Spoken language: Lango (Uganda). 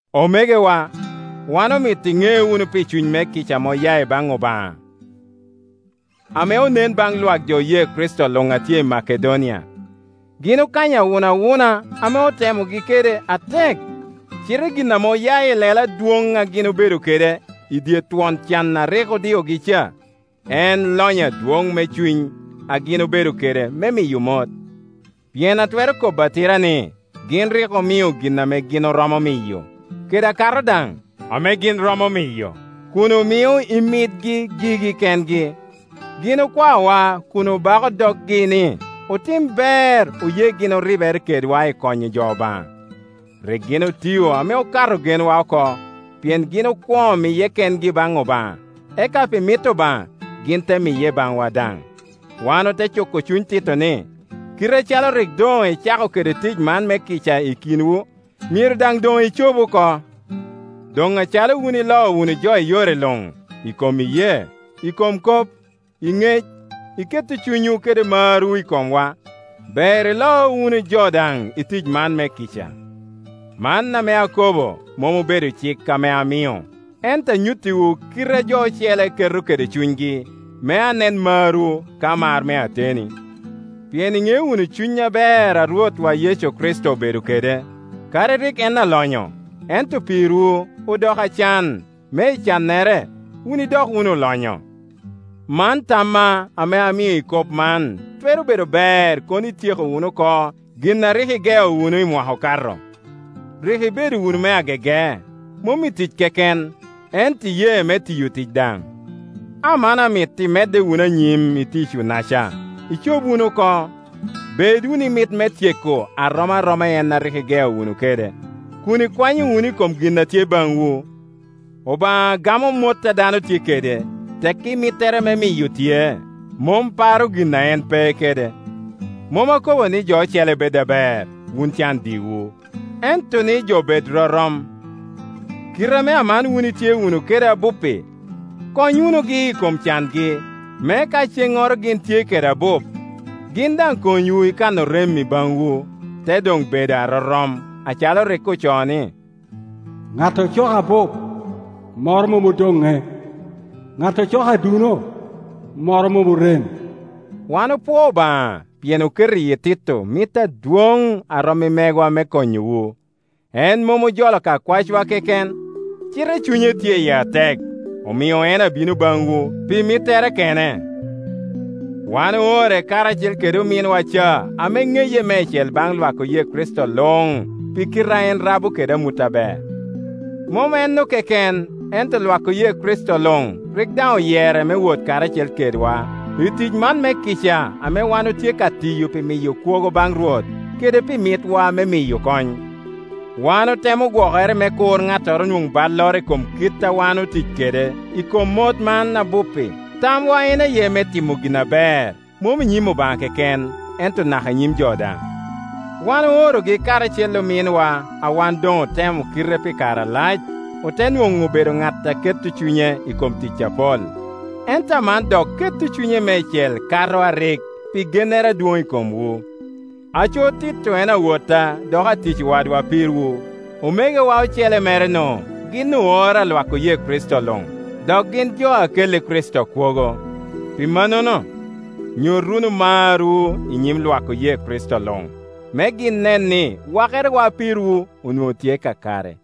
Omegowa, wan omito iŋe wunu pi cuny me kica ame oya ibaŋ Obaŋa ame onen baŋ Iwak jo oye Kricito luŋ a tye i Makedonia. Gin okanyo awunawuna ame otemogi kede atek, cite gin ame oya ilelo adwoŋ a gin obedo kede i dye twon can a rik odiogi ca, en lonyo adwoŋ me cuny a gin obedo kede me miyo mot. Pien atwero kobo atira ni gin rik omio gin ame gin oromo miyo, kede akato daŋ ame gin romo miyo, kun omio i mitgi gigi kengi. Gin okwaowa kun obako doggi ni otim ber, oye gin oribere kedwa i konyo jo Obaŋa. Rik gin otio ame okato genwa oko, pien gin okwoŋo miye kengi baŋ Obaŋa, eka pi mit Obaŋa gin te miye baŋwa daŋ. Wan ote cuko cuny Tito ni, kite acalo rik doŋ ecako kede tic man me kica i kinwu, myero daŋ doŋ ecob oko. Doŋ acalo wun iloo wunu jo i yore luŋ, i kom iyee, i kobo kop, i ŋec, i keto cunywu kede marwu i komwa, ber ilo wunu jo daŋ i tic man me kica. Man ame akobo mom obedo cik ame amio, ento anyuttiwu kite a jo ocele keto kede cunygi, me anen marwu ka mar me ateni. Pien iŋeo wunu cuny aber ame Rwotwa Yecu Kricito obedo kede; kadi rik en alonyo, ento pirwu odoko acan, me i cannere wun idok wunu olonyo. Man tamma ame amio i kop man: twero bedo ber kono ityeko wunu oko gin a rik igeo wunu i mwaka okato. Rik ibedo wunu me agege, mom i tic keken, ento i ye me tiyo tic daŋ. Aman amito imedde wunu anyim i ticwu-naca, icob wunu oko. Bed wunu i mit me tyeko a rom aroma i en a rik igeo wunu kede, kun ikwanyo wunu i kom gin a tye baŋwu. Obaŋa gamo mot a dano tye kede, tekki mittere me miyo tye; mom paro gin a en pe kede. Mom akobo ni jo ocele bed aber, wunu can diwu, ento ni jo bed rorom. Kite ame aman wun itye wunu kede abup-pi, kony wunugi i kom cangi, me ka cennoro gin tye kede abup, gin daŋ konywu i kan orem i baŋwu, te doŋ bedo arorom; acalo rik ocoo ni. “Ŋat ocoko abup, moro mom odoŋŋe, ŋat ocoko aduno, moro mom orem.” Wan opwoo Obaŋa pien oketo i yi Tito mit adwoŋ a rom i megwa me konyowu. En mom ojolo ka kwacwa keken, cite cunye tye iye atek, omio en abino baŋwu pi mittere, kene. Wan oore karacel kede ominwa ca ame ŋeye meicel baŋ lwak oye Kricito luŋ pi kite a en rabo kede amut aber. Mom enno keken, ento Lwak oye Kricito luŋ rik daŋ oyere me wot karacel kedwa i tic man me kica ame wan otye ka tiyo pi miyo kwogo baŋ Rwot kede pi mitwa me miyo kony. Wan otemo gwokere me kur ŋattoro nwoŋ balloro i kom kit a wan otic kede i kom mot man abup-pi. Tamwa en aye me timo gin aber, mom i nyim Obaŋa keken, ento naka i nyim jo daŋ. Wan oorogi karacel kede ominwa a wan doŋ otemo kite pi kare alac, ote nwoŋo obedo ŋat a keto cunye i kom tic apol, ento aman dok keto cunye meicel kato a rik, pi gennere adwoŋ i komwu. Aco Tito en awotta dok atic wadwa pirwu; omegowa ocele mere-nu gin oor a Lwak oye Kricito luŋ, dok gin jo a kelli Kricito kwogo. Pi mannono, nyut wunu marwu i nyim Iwak oye Kricito luŋ, me gin nen ni wakerewa pirwu onwoŋo tye kakare.